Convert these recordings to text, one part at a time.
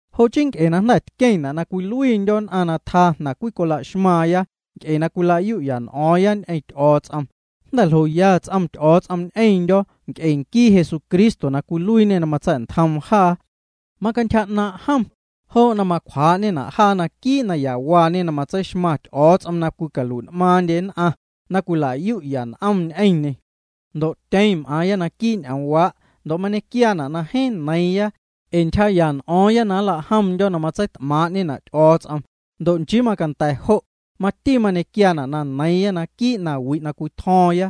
Jo' chii nc'e na jnda̱ tqueⁿna' na cwiluiindyo̱ nn'aⁿ na tjaa jnaⁿ cwicolaxmaaⁿya nc'e na cwila'yu'ya n'o̱o̱ⁿya ñ'eⁿ Ty'o̱o̱ts'om, jnda̱ ljoya ts'om Ty'o̱o̱ts'om ñ'eⁿndyo̱ nc'e nquii Jesucristo na cwiluiiñe na matsa̱'ntjom jaa. Macantyja 'naaⁿ' jom, jo' na macwjaa'ñena' jaa naquii' nayawaañe na matseixmaⁿ Ty'o̱o̱ts'om na cwicalui'n'maaⁿndye nn'aⁿ, na cwila'yu'ya n'om ñ'eⁿñê. Ndo' tyeⁿ m'aaⁿya naquii' ñ'oomwaa' ndo' mañequiaana' na jeeⁿ neiiⁿya, ee ntyjaa'ya n'o̱o̱ⁿya na nla'jomndyo̱ na matseit'maaⁿ'ñena' Ty'o̱o̱ts'om. Ndo' nchii macanda̱ jo', mati mañequiaana' na neiiⁿya naquii' nawi' na cwitjo̱o̱ⁿya.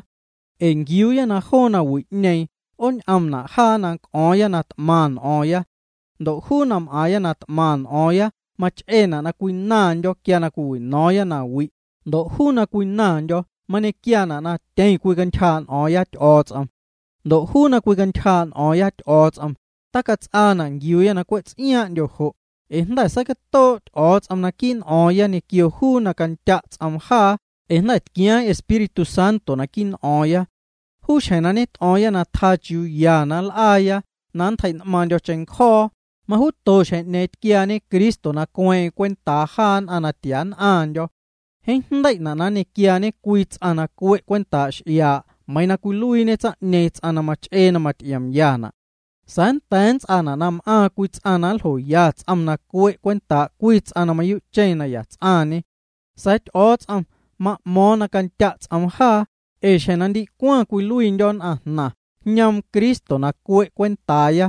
Ee nquiuuya na joo nawi'ñeeⁿ 'oon'omna' jaa na c'o̱o̱ⁿya na t'maⁿ n'o̱o̱ⁿ. Ndo' juu na m'aaⁿya na t'maⁿ n'o̱o̱ⁿya mach'eena' na cwinaⁿndyo̱ quia cwiwino̱o̱ⁿya nawi', ndo' juu na cwinaⁿndyo̱ mañequiaana' na tyeⁿ cwicantyjaa' n'o̱o̱ⁿya Ty'o̱o̱ts'om. Ndo' juu na cwicantyjaa'ya n'o̱o̱ⁿya Ty'o̱o̱ts'om, tacats'aana' nquiuuya na cwe' ts'iaaⁿ'ndyo jo', ee jnda̱ seicatoo' Ty'o̱o̱ts'om naquii' n'o̱o̱ⁿya ñequio juu na candya' ts'oom jaa ee jnda̱ tquiaaⁿ Espíritu Santo naquii' n'o̱o̱ⁿya. Juu xjeⁿ na ñet'o̱o̱ⁿya na tjaa chiuuya na nl'aaya na nntjei'n'maaⁿndyo̱ cheⁿncjo̱o̱, majuuto xjeⁿ'ñeeⁿ tquiaañe Cristo na cueeⁿ'eⁿ cwentaa jaa nn'aⁿ na tia nn'aⁿndyo̱. Jeeⁿ jndei'na' na nñequiaañe ts'aⁿ na cue' cwentaa' x'iaa' meiiⁿ cwiluiiñe tsaⁿ'ñeeⁿ ts'aⁿ na mach'ee na maty'iomyana'. Sa̱a̱ nnda̱a̱ nnts'aana' na m'aaⁿ cwii ts'aⁿ na nljoya ts'om na cue' cwentaa' cwii ts'aⁿ na mayuu'cheⁿ ya ts'aⁿñe. Sa̱a̱ Ty'o̱o̱ts'om ma'mo̱o̱ⁿ na candya' ts'oom jaa, ee xjeⁿ na ndicwaⁿ cwiluiindyo̱ nn'aⁿjnaⁿ jñoom Cristo na cue' cwentaaya.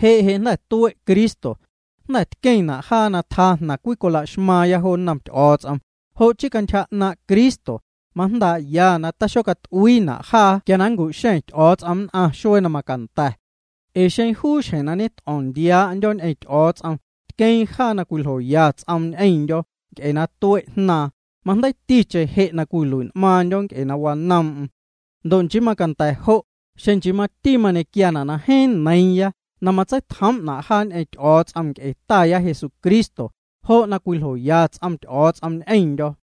Je' je' na jnda̱ tue' Cristo, jnda̱ tqueⁿna' jaa na tjaa jnaⁿ cwicola'xmaaⁿya jo nnom Ty'o̱o̱ts'om, jo' chii cantyja 'naaⁿ' Cristo, majndaa'ya na taxocat'uiina' jaa quia na nncu'xeⁿ Ty'o̱o̱ts'om nn'aⁿ xuee na macanda̱. Ee xeⁿ juu xjeⁿ na ñet'o̱o̱ⁿ nndiaa'ndyo̱ ñ'eⁿ Ty'o̱o̱ts'om tqueeⁿ jaa na cwiljoya ts'oom ñ'eⁿndyo̱ nc'e na tue' Jnaaⁿ, majndeiticheⁿ je' na nlui'n'maaⁿndyo̱ nc'e na wanoom'm. Ndo' nchii macanda̱ jo', xeⁿ nchii mati mañequiaana' na jeeⁿ neiiⁿya na matseitjoom'na' jaa ñ'eⁿ Ty'o̱o̱ts'om nc'e Taya Jesucristo jo' na cwiljoya ts'om Ty'o̱o̱ts'om ñ'eⁿndyo̱.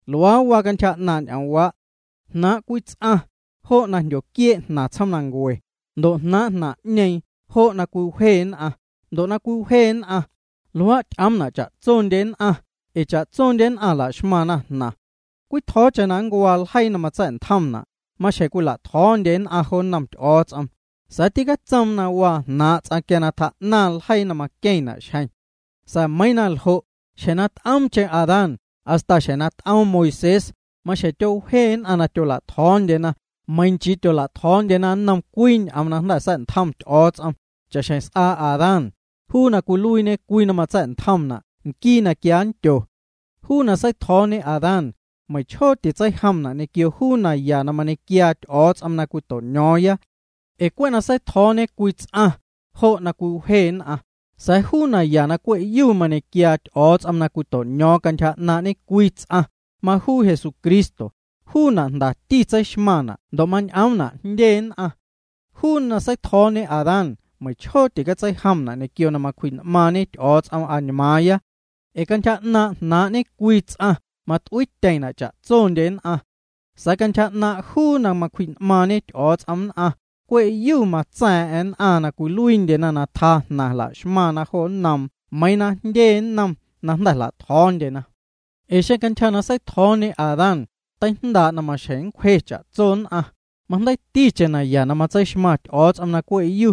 Luaa waa cantyja 'naaⁿ' ñ'oomwaa'. Jnaaⁿ' cwii ts'aⁿ, jo' na jndyoquiee' jnaⁿ tsjoomnancue ndo' jnaaⁿ' jnaⁿ'ñeeⁿ jo' na cwiwje nn'aⁿ ndo' na cwiwje nn'aⁿ, luaa' ty'oomna' cha'tsondye nn'aⁿ ee cha'tsondyena laxmaⁿna jnaⁿ. Cwitjo̱o̱cheⁿ na nncuaa ljeii na matsa̱'ntjomna', maxjeⁿ cwila'tjo̱o̱ndye nn'aⁿ jo nnom Ty'o̱o̱ts'om, sa̱a̱ tîcatsoom na waa jnaaⁿ' ts'aⁿ quia na tjaa'naⁿ ljeii na maqueⁿna' xjeⁿ. Sa̱a̱ meiiⁿ na ljo', xjeⁿ na t'oomcheⁿ Adán hasta xjeⁿ na t'oom Moisés, maxjeⁿ tyowje nn'aⁿ na tyola'tjo̱o̱ndyena meiiⁿ na nchii tyola'tjo̱o̱ndyena nnom cwii ñ'oom na jnda̱ sa̱'ntjom Ty'o̱o̱ts'om, cha'xjeⁿ s'aa Adán, juu na cwiluiiñe cwii na matseijomna' nquii na quia nndyo. Juu na seitjo̱o̱ñe Adán, meiⁿchjoo titseijomna' ñequio juu naya na mañequiaa Ty'o̱o̱ts'om na cwito'ño̱o̱ⁿya. Ee cwe' na seitjo̱o̱ñe cwii ts'aⁿ, jo' na cwiwje nn'aⁿ, sa̱a̱ juu naya na cwe'yu na mañequiaa Ty'o̱o̱ts'om na cwito'no̱o̱ⁿ cantyja 'naaⁿ' ñecwii ts'aⁿ, majuu Jesucristo, juuna' jndati tseixmaⁿna' ndo' mañ'omna' jndyendye nn'aⁿ. Juu na seitjo̱o̱ñe Adán, meiⁿchjoo ticatseijomna' ñequio na macwji'n'maaⁿñe Ty'o̱o̱ts'om añmaaⁿya. Ee cantyja 'naaⁿ' jnaaⁿ' ñecwii ts'aⁿ mat'uiityeⁿna' cha'tsondye nn'aⁿ. Sa̱a̱ cantyja 'naaⁿ' juu na macwji'n'maaⁿñe Ty'o̱o̱ts'om nn'aⁿ, cwe'yu matsa̱a̱ⁿ'a̱ⁿ nn'aⁿ na cwiluiindyena na tjaa jnaⁿ la'xmaⁿna jo nnoom meiiⁿ na jndye nnom jnda̱ jla'tjo̱o̱ndyena. Ee xeⁿ cantyja na seitjo̱o̱ñe Adán, teijndaa' na maxjeⁿ nncwje cha'tso nn'aⁿ, majndeiiticheⁿ naya na matseixmaⁿ Ty'o̱o̱ts'om na cwe'yu,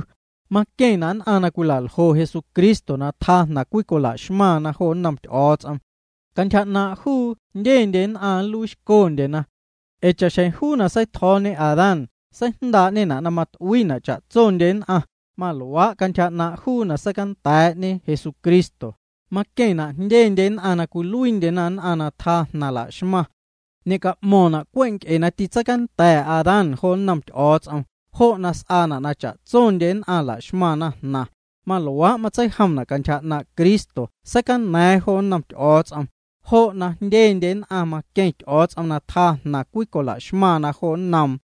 maqueⁿna' nn'aⁿ na cwilaljo Jesucristo na tjaa jnaⁿ cwila'xmaⁿna jo nnom Ty'o̱o̱ts'om. Cantyja 'naaⁿ' juu jndyendye nn'aⁿ nluiixcondyena. Ee cha'xjeⁿ juu na seitjo̱o̱ñe Adán seijndaa'ñena' na mat'uiina' cha'tsondye nn'aⁿ, maluaa' cantyja 'naaⁿ' juu na seicanda̱a̱'ñe Jesucristo, maqueⁿna' jndye nn'aⁿ na cwiluiindyena nn'aⁿ na tjaa jnaⁿ la'xmaⁿ. Ñe'ca'mo̱ⁿna' cwe' nc'e na tîtseicanda̱ Adán jo nnom Ty'o̱o̱ts'om jo' na s'aana' na cha'tsondye nn'aⁿ la'xmaⁿna jnaⁿ, maluaa' matseijomna' cantyja 'naaⁿ' Cristo seicana̱a̱ⁿ jo nnom Ty'o̱o̱ts'om, jo' na jndyendye nn'aⁿ maqueⁿ Ty'o̱o̱ts'om na tjaa jnaⁿ cwicola'xmaⁿna jo nnoom.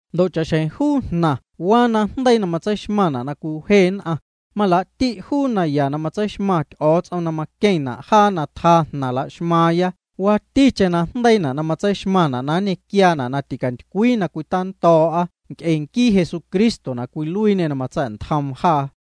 Ndo' cha'xjeⁿ juu jnaⁿ waa najndeii na tseixmaⁿna' na cwje nn'aⁿ, malaa'ti' juu naya na matseixmaⁿ Ty'o̱o̱ts'om na maqueⁿna' jaa na tjaa jnaⁿ la'xmaaⁿya waaticheⁿ najndeii na matseixmaⁿna' na nñequiaana' na ticantycwii na cwitando̱o̱'a nc'e nquii Jesucristo na cwiluiiñê na matsa̱'ntjoom jaa.